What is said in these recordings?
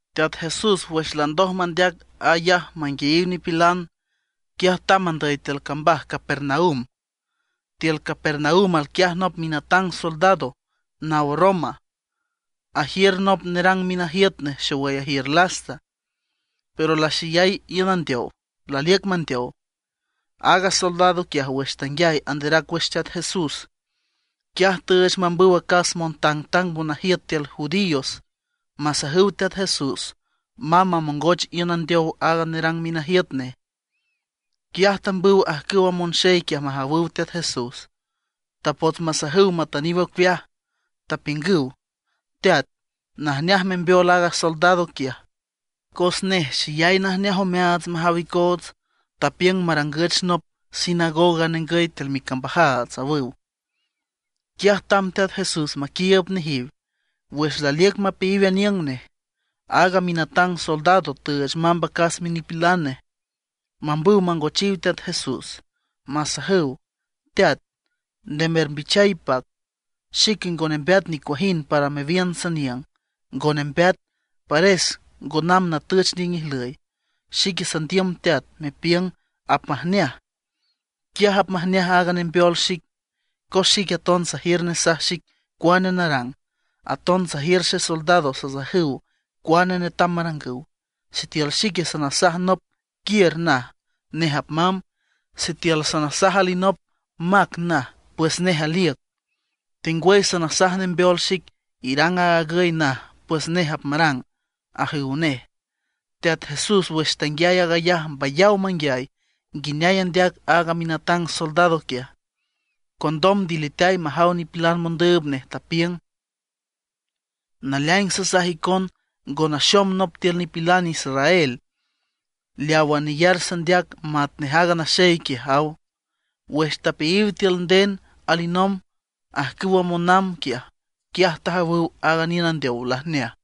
Teat Jesús wüx landoj mandeac aag ayaj manguiayiw nipilan, quiaj tamb andüy tiül cambaj Capernaum. Tiül Capernaum alquiaj nop minatang soldado naw Roma, ajiür nop nerang minajiüt nej xowüy ajiür lasta; pero laxeyay iün andeow, laliüc mandeow. Aaga soldado quiaj wüx tanguiay anderac wüx Teat Jesús, quiaj tüüch mambüw acas montangtang monajiüt tiül judíos masajüw Teat Jesús mamb mamongoch iün andeow aaga nerang minajiüt nej. Quiaj tambüw ajcüwa monxey quiaj majawüw Teat Jesús. Tapots masajüw matüniw ocueaj, tapiüngüw: ―Teat, najneaj membeol aaga soldado quiaj; cos nej xeyay najneaj omeaats majaw icoots, tapiüng marangüch nop sinagoga ningüy tiül micambajaats ―awüw. Quiaj tamb Teat Jesús maquiiüb nejiw. Wüx laliüc mapeayiw aniüng nej, aaga minatang soldado tüüch mamb acas minipilan nej mambüw mangochiw Teat Jesús, masajüw: ―Teat, nde mermbichay ipac. Xique ngo nembeat nicuajind, para mewiün saniüng. Ngo nembeat, pares ngo namb natüch niüng ijlüy. Xique sandiüm teat, mepiüng apmajneaj, quiaj apmajneaj aaga nembeol xic. Cos xique aton sajiür nesaj xic cuane narang, aton sajiür xesoldado sasajüw cuane netam marangüw. Sitiül xique sanasaj nop: “Quiür”, naj; nej apmamb. Sitiül sanasaj alinop: “Mac”, naj, pues nej aliüc. Tengwüy sanasaj nembeol xic: “Irang aag agüy”, naj, pues nej apmarang ―ajüw nej. Teat Jesús wüx tanguiay aag ayaj mbayaw manguiay nguineay andeac aaga minatang soldado quiaj. Condom ndiliteay majaw nipilan mondüüb nej, tapiüng: ―Naleaing sasaj icon, ngo naxom nop tiül nipilan israel leawa neyar sandeac matnej aaga naxey quiaj ―aw. Wüx tapeayiw tiül nden alinomb ajcüwa monamb quiaj, quiaj tajawüw aaga niün andeow lajneaj.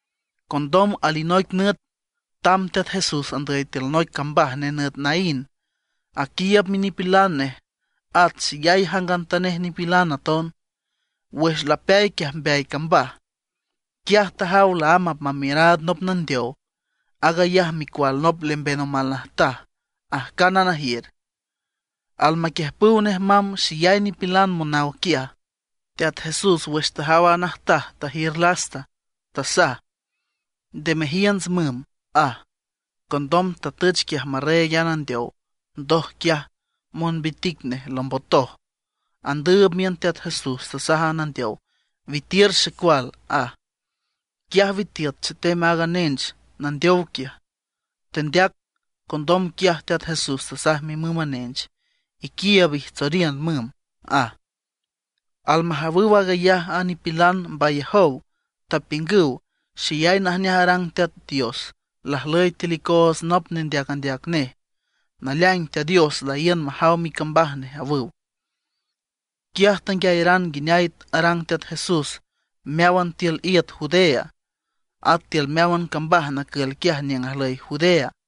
Condom alinoic nüt tamb Teat Jesús andüy tiül noic cambaj nenüt Naín, aquiiüb minipilan nej, at xeyay jangantanej nipilan aton. Wüx lapeay quiaj mbeay cambaj, quiaj tajaw laámb apmamiüraad nop nandeow, aag ayaj micual nop lemben omal najtaj ajcánan ajiür. Almaquiüjpüw nej mamb xeyay nipilan monaw quiaj. Teat Jesús wüx tajaw aaga najtaj tajiür lasta, tasaj: ―Nde mejiünts müm ―aj. Condom tatüch quiaj marreeg a nandeow, ndoj quiaj monbitic nej lombotoj. Andüüb miün Teat Jesús tasaj a nandeow: ―¡Witiür xecual! ―aj. Quiaj witiüt chetem aaga nench nandeow quiaj, tendeac. Condom quiaj Teat Jesús tasaj mimüm a nench: ―Iquiiüb ijtsoriün müm ―aj. Almajawüw aag ayaj a nipilan mbayajow, tapiüngüw: ―Xeyay najneaj arang Teat Dios. Lajlüy tiül icoots nop nendeac andeac nej. Naleaing Teat Dios laíün majaw micambaj nej ―awüw. Quiaj tanguiayaran nguineay arang Teat Jesús meáwan tiül iüt Judea, at tiül meáwan cambaj nacül quiaj niüng ajlüy Judea.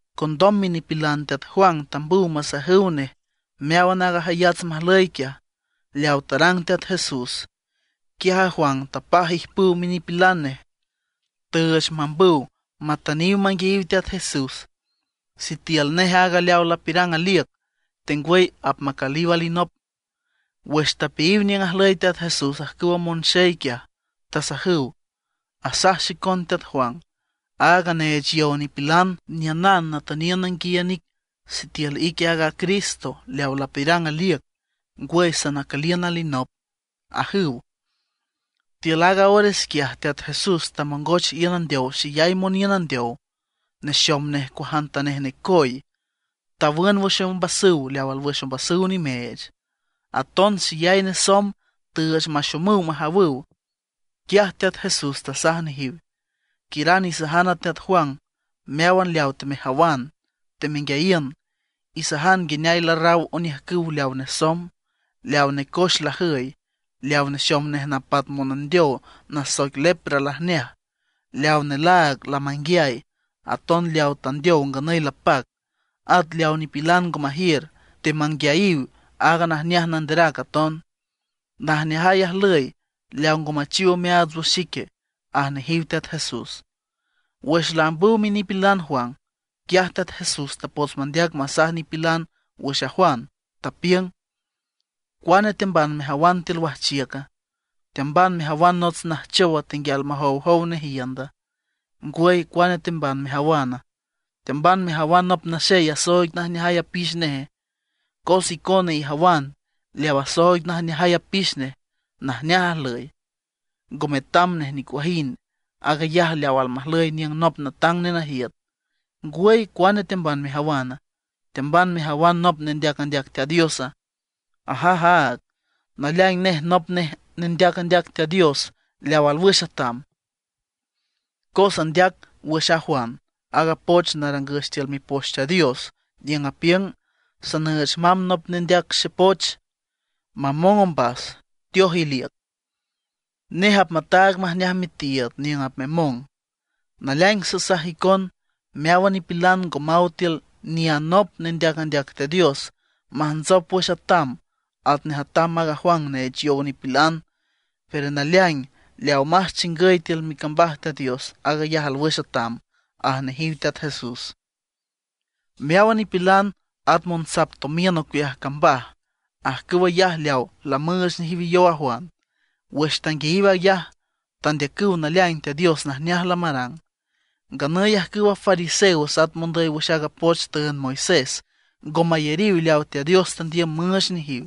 Condom minipilan teat Juan tambüw masajüw nej meáwan aaga jayats majlüy quiaj, leawa tarang Teat Jesús. Quiaj a Juan tapaj ijpüw minipilan nej. Tüüch mambüw matüniw manguiayiw Teat Jesús sitiül nej aaga leaw lapiürang aliüc, ngwüy apmacüliw alinop. Wüx tapeayiw niüng ajlüy Teat Jesús ajcüw a monxey quiaj, tasajüw: ―Asaj xicon teat Juan, aaga neech yow nipilan, niünan natüniün nanguiayiün ic sitiül ique aaga Cristo leaw lapiürang aliüc, ngwüy sanacüliün alinop ―ajüw. Tiül aaga ores quiaj Teat Jesús tamongoch iün andeow xeyay moniün andeow, nexom nejiw cuajantanej necoy. Tawün wüx ombasüw leaw alwüx ombasüw nimeech. Aton xeyay nesomb tüüch maxomüw majawüw. Quiaj Teat Jesús tasaj nejiw: ―Quiüran isajan a teat Juan meáwan leaw temejawan temenguiayiün. Isajan nguineay larraw oniüjcüw leaw nesomb, leaw necoex lajüy, leaw nexom nej napat monandeow nasoic lepra lajneaj, leaw nelaag lamanguiay, aton leaw tandeow nganüy lapac. At leaw nipilan ngo majiür, temanguiayiw aaga najneaj nanderac aton. Najneajay ajlüy leaw ngo machiw omeaats wüx xique ―aj nejiw Teat Jesús. Wüx laambüw minipilan Juan, quiaj Teat Jesús tapots mandeac masaj nipilan wüx a Juan, tapiüng: ―¿Cuane teamban mejawan tiül wajchiüca? ¿Teamban mejawan nots najchowa tenguial majowjow nej iünda? ¿Ngwüy, cuane teamban mejawana? ¿Teamban mejawan nop naxey asooig najneajay apix neje? Cos icona ijawan leaw asooig najneajay apix nej najneaj ajlüy, ngo metam nej nicuajind, aag ayaj leaw almajlüy aniüng nop natang nenajiüt. ¿Ngwüy, cuane teamban mejawana? ¿Teamban mejawan nop nendeac andeac Teat Diosa? Ajaj áag, naleaing nej nop nej nendeac andeac Teat Dios leaw alwüx atam. Cos andeac wüx a Juan aaga poch narangüch tiül Mipoch Teat Dios, niüng apiüng: Sanüüch mamb nop nendeac xepoch mamong ombas, teoj iliüc. Nej apmataag majneaj mitiiüd niüng apmemong. Naleaing sasaj icon, meáwan nipilan ngo maw tiül ni anop nendeac andeac Teat Dios majntsop wüx atam atnej atam aaga Juan neech yow nipilan. Pero naleaing, leawa más chingüy tiül micambaj Teat Dios, aag ayaj alwüx atam ―aj nejiw Teat Jesús. Meáwan nipilan, at monsap tomiün ocueaj cambaj, ajcüw ayaj leaw lamüüch nejiw yow a Juan, wüx tanguiayiw aag ayaj tandeacüw naleaing Teat Dios najneaj lamarang. Nganüy ajcüwa fariseos at mondüy wüx aaga poch tüünd Moisés ngo mayariw leaw Teat Dios tandiüm müüch nejiw,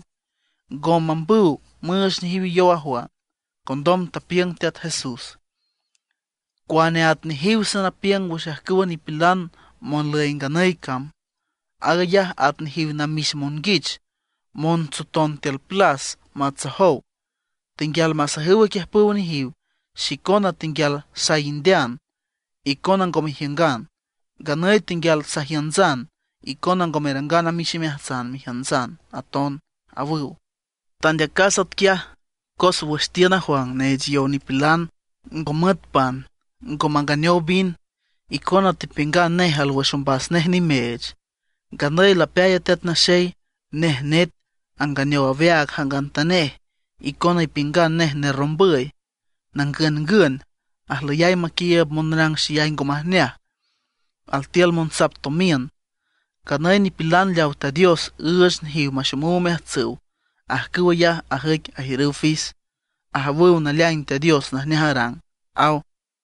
ngo mambüw müüch nejiw yow a Juan. Condom tapiüng Teat Jesús: ―¿Cuane at nejiw sanapiüng wüx ajcüwa nipilan monlüy nganüy cama? Aag ayaj at nejiw namix monguich montsoton tiül plas matsojow, tenguial masajüw aquiüjpüw nejiw: “Xicona tenguial saindean, icona ngo mejiüngan; nganüy tenguial sajiüntsan, icona ngo merangan amix imeajtsan mejiüntsan aton”, awüw. Tandeacas atquiaj cos wüx tiün a Juan neech yow nipilan, ngo müet pan ngo manganeow vin, icona tepiüngan nej alwüx ombas nej nimeech. Nganüy lapeay a Teat Naxey; nej net, anganeow aweaag jangantanej. Icona ipiüngan nej nerrombüy, nangüngün, ajlüyay maquiiüb monrang xeyay ngo majneaj, altiül monsap tomiün. Nganüy nipilan leaw Teat Dios üüch nejiw maxomüw omeajtsüw, ajcüw ayaj ajüic ajiürüw fis, ajawüw naleaing Teat Dios najneaj arang ―aw.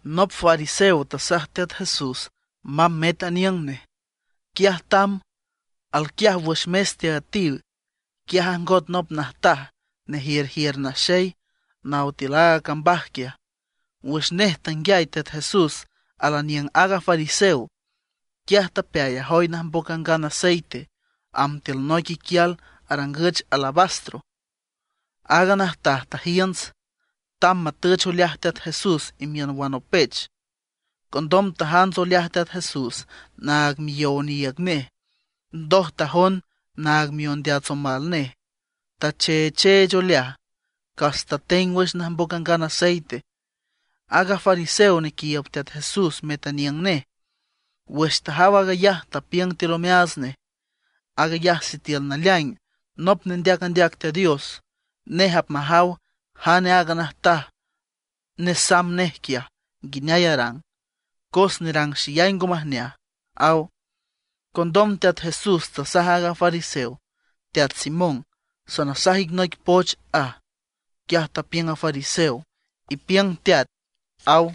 Nop fariseo tasaj Teat Jesús mamb met aniüng nej, quiaj tamb. Alquiaj wüx mes teaüetiw. Quiaj ajngot nop najtaj nejiürjiür naxey, naw tiül aaga cambaj quiaj. Wüx nej tanguiay Teat Jesús alaniüng aaga fariseo, quiaj tapeay ajoy najmboc angan aceite, amb tiül noic iquial arangüch alabastro. Aaga najtaj tajiünts, tamb matüch oleaj Teat Jesús imiün wanopech. Condom tajants oleaj Teat Jesús naag miyow oniiüg nej, ndoj tajond naag miondeats omal nej, tacheecheech oleaj, cas tateng wüx najmboc angan aceite. Aaga fariseo nequiiüb Teat Jesús met aniüng nej, wüx tajaw aag ayaj tapiüng tiül omeaats nej: “Aag ayaj sitiül naleaing nop nendeac andeac Teat Dios, nej apmajaw jane aaga najtaj nesamb nej quiaj nguineay arang, cos nerang xeyay ngo majneaj”, aw. Condom Teat Jesús tasaj aaga fariseo: ―Teat Simón, sanasaj ic noic poch ―aj. Quiaj tapiüng a fariseo: ―Ipiüng teat ―aw.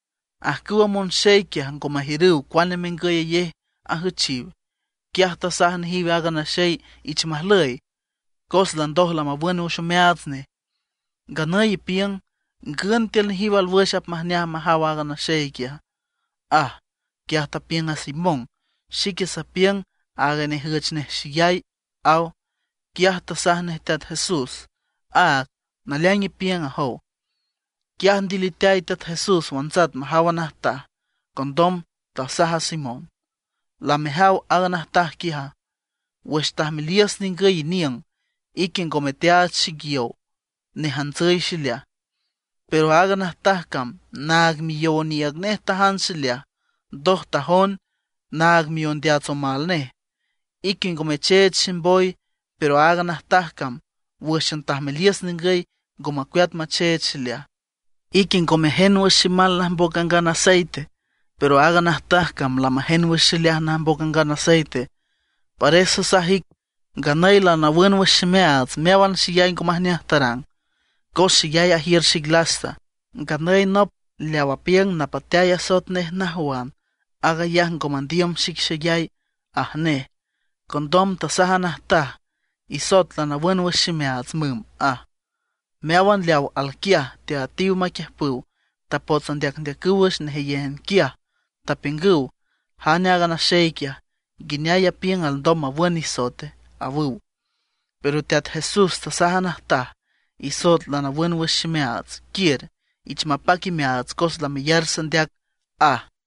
Ajcüwa monxey quiaj ngo majiürüw cuane mengüyayej ajüchiw. Quiaj tasaj nejiw aaga naxey ich majlüy, cos landoj lamawün wüx omeaats nej. Nganüy ipiüng ¿ngün tiül nejiw alwüx apmajneaj majaw aaga naxey quiaja? ―aj. Quiaj tapiüng a Simón: ―Xique sapiüng aaga nejüch nej xeyay ―aw. Quiaj tasaj nej Teat Jesús: ―Áag, naleaing ipiüng ―ajow. Quiaj ndiliteay Teat Jesús, wantsat majaw a najtaj, condom tasaj a Simón: ―¿Lamejaw aaga najtaj quiaja? Wüx tajmeliüs ningüy iniüng, ique ngome teaach xic yow nejantsüy xileaj; pero aaga najtaj cam naag miyow oniiüg nej tajants xileaj, ndoj tajond naag miondeats omal nej. Ique ngo mecheech ximboy, pero aaga najtaj cam wǘxan tajmeliüs ningüy ngo macueat macheech xileaj. Ique ngo mejend wüx ximal najmboc angan aceite, pero aaga najtaj cam lamajend wüx xileaj najmboc angan aceite. Pares sasaj ic, nganüy lanawün wüx ximeaats meáwan xeyay ngo majneaj tarang, cos xeyay ajiür xic lasta. Nganüy nop leaw apiüng napateay asoet nej najwan, aag ayaj ngo mandiüm xic xeyay ―aj nej. Condom tasaj a najtaj: ―Isoet lanawün wüx ximeaats müm ―aj. Meáwan leaw alquiaj teaüetiw maquiüjpüw tapots andeacndeacüw wüx nejeyéjan quiaj, tapiüngüw: ―¿Jane aaga naxey quiaja? ¿Nguineay apiüng alndom mawün nisoete? ―awüw. Pero Teat Jesús tasaj a najtaj: ―Isoet lanawün wüx ximeaats. Quiür, ich mapac imeaats cos lameyar sandeac ―aj.